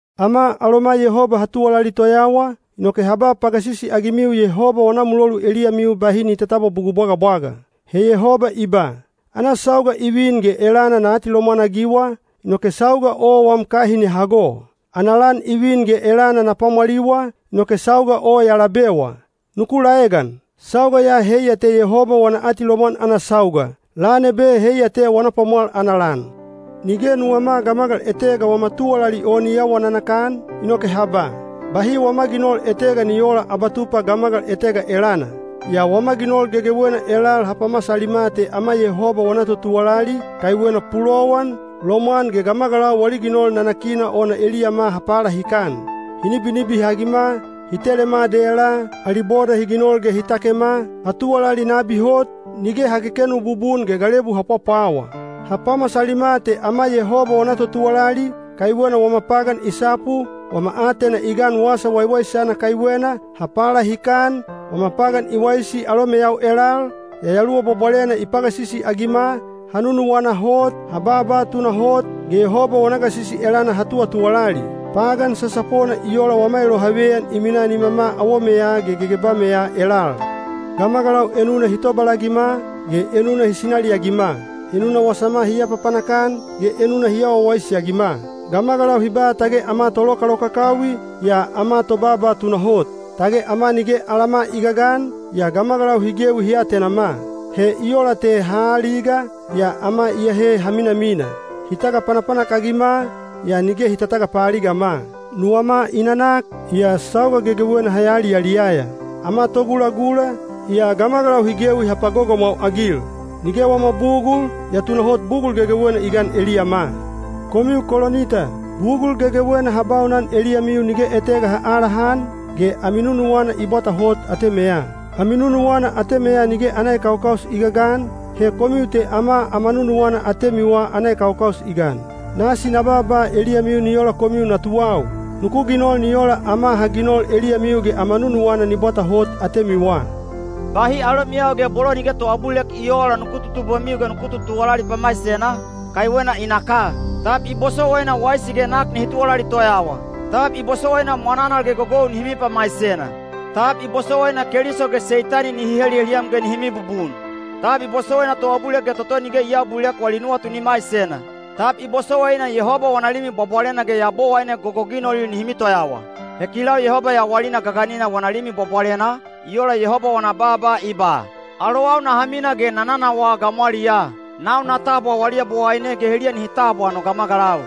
Ama aloma Yehoba ha tuwalali toyawa, inoke ha ba pagasisi-agimiu Yehoba wana mulolu eliyamiu bahi ni tatabwa bugul bwagabwaga. He Yehoba i ba: “Ana sauga i vin ge elana na atilomwan-agiwa, inoke sauga o wam kahin ya hago. Ana lan i vin ge elana na pwamwaliwa, inoke sauga o ya labewa.” Nuku laegan! Sauga ya heiya te Yehoba wana atilomwan ana sauga; lan ebe heiya te wana pwamwal ana lan. Nige nuwama gamagal etega wama tuwalali o ni awa nanakan, inoke ha ba, “Bahi wama ginol etega ni oola abatupa gamagal etega elana.” Yaa wama ginol gegewena elal ha pamasalima te ama Yehoba wana totuwalali, kaiwena pulowan, lomwan ge gamagalau wali ginol nanakina ona eliyama ha palahikan. Hi nibinibihagima, hi telema dela, ali boda hi ginol ge hi takema, ha tuwalali nabi hot, nige ha kekenu bubun ge galebu ha pwapwawa. Ha pamasalima te ama Yehoba wana totuwalali, kaiwena wama pagan i sapu, wama aatena i gan Wasa Waiwaisana kaiwena, ha palahikan, wama pagan i waisi alomeyau elal, Yayaluwa Bwabwalena i pagasisi-agima, ha nununuwana hot, ha baaba tunahot, ge Yehoba wana gasisi elana ha tuwatuwalali. Pagan sasapona i ola wama elohaveyan i minaa nimama awomeya ge gegebameya elal. Gamagalau enuna hi tobalagima, ge enuna hi sinaliagima; enuna wasama hi apapanak-an, ge enuna hi awa wawaisi-agima. Gamagalau hi ba tage ama tolokalokakawi, yaa ama tobaaba tunahot; tage ama nige alama i gagan, yaa gamagalau hi gewi hi atenama. He i ola te ha aaliga, yaa ama iyahe ha minamina; hi tagapanapanak-agima, yaa nige hi tatagapaaligama. Nuwama i nanak, yaa sauga gegewena ha yaliyaliyaya; ama togulagula, yaa gamagalau hi gewi ha pagogomwau-agil; nige wama bugul, yaa tunahot bugul gegewena i gan eliyama. Komiu Kolinita, bugul gegewena ha baunan eliyamiu nige etega ha aalahan, ge ami nunuwana i bwata hot atemeya. Ami nunuwana atemeya nige ana ekaukaus i gagan, he komiu te ama ama nunuwana atemiwa ana ekaukaus i gan. Nasi na baaba eliyamiu ni ola komiu natuwau: nuku ginol ni ola ama ha ginol eliyamiu ge ama nunuwana ni bwata hot atemiwa. Bahi alomiyau ge bolo nige toabulilek i oola nuku tutubwemiu ge nuku tutuwalali pamaisena, kaiwena i naka. Tab i bosowaina waisi ge nak nihi tuwalali toyawa? Tab i bosowaina mwananal ge gogou nihi mipamaisena? Tab i bosowaina Keliso ge Seitani nihi heliheliyam ge nihi mibubun? Tab i bosowaina toabulilek ge toto nige i aabulilek wali nuwatu ni maisena? Tab i bosowaina Yehoba wana Limi Bwabwalena ge yabowaine gogoginolil nihi mitoyawa? He kilau Yehoba yawalina gaganina wana Limi Bwabwalena, i ola Yehoba wana baaba i ba, “Alowau naha mina ge na nanawaa gamwaliyaa. Nau na tabwa wali Yabowaine ge heliya nihi tabwa no gamagalau.”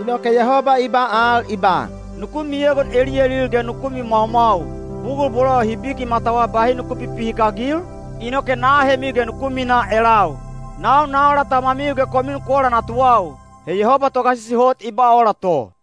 Inoke Yehoba i ba al i ba, “Nuku miegon eliyalil ge nuku mimwaumwau. Bugul bolo hi biki matawa bahi nuku pipihikagil, inoke na ahemiu ge nuku minaa elau. Nau na ola Tamamiu ge komiu nuku ola natuwau.” He Yehoba Togasisi Hot i ba ola to.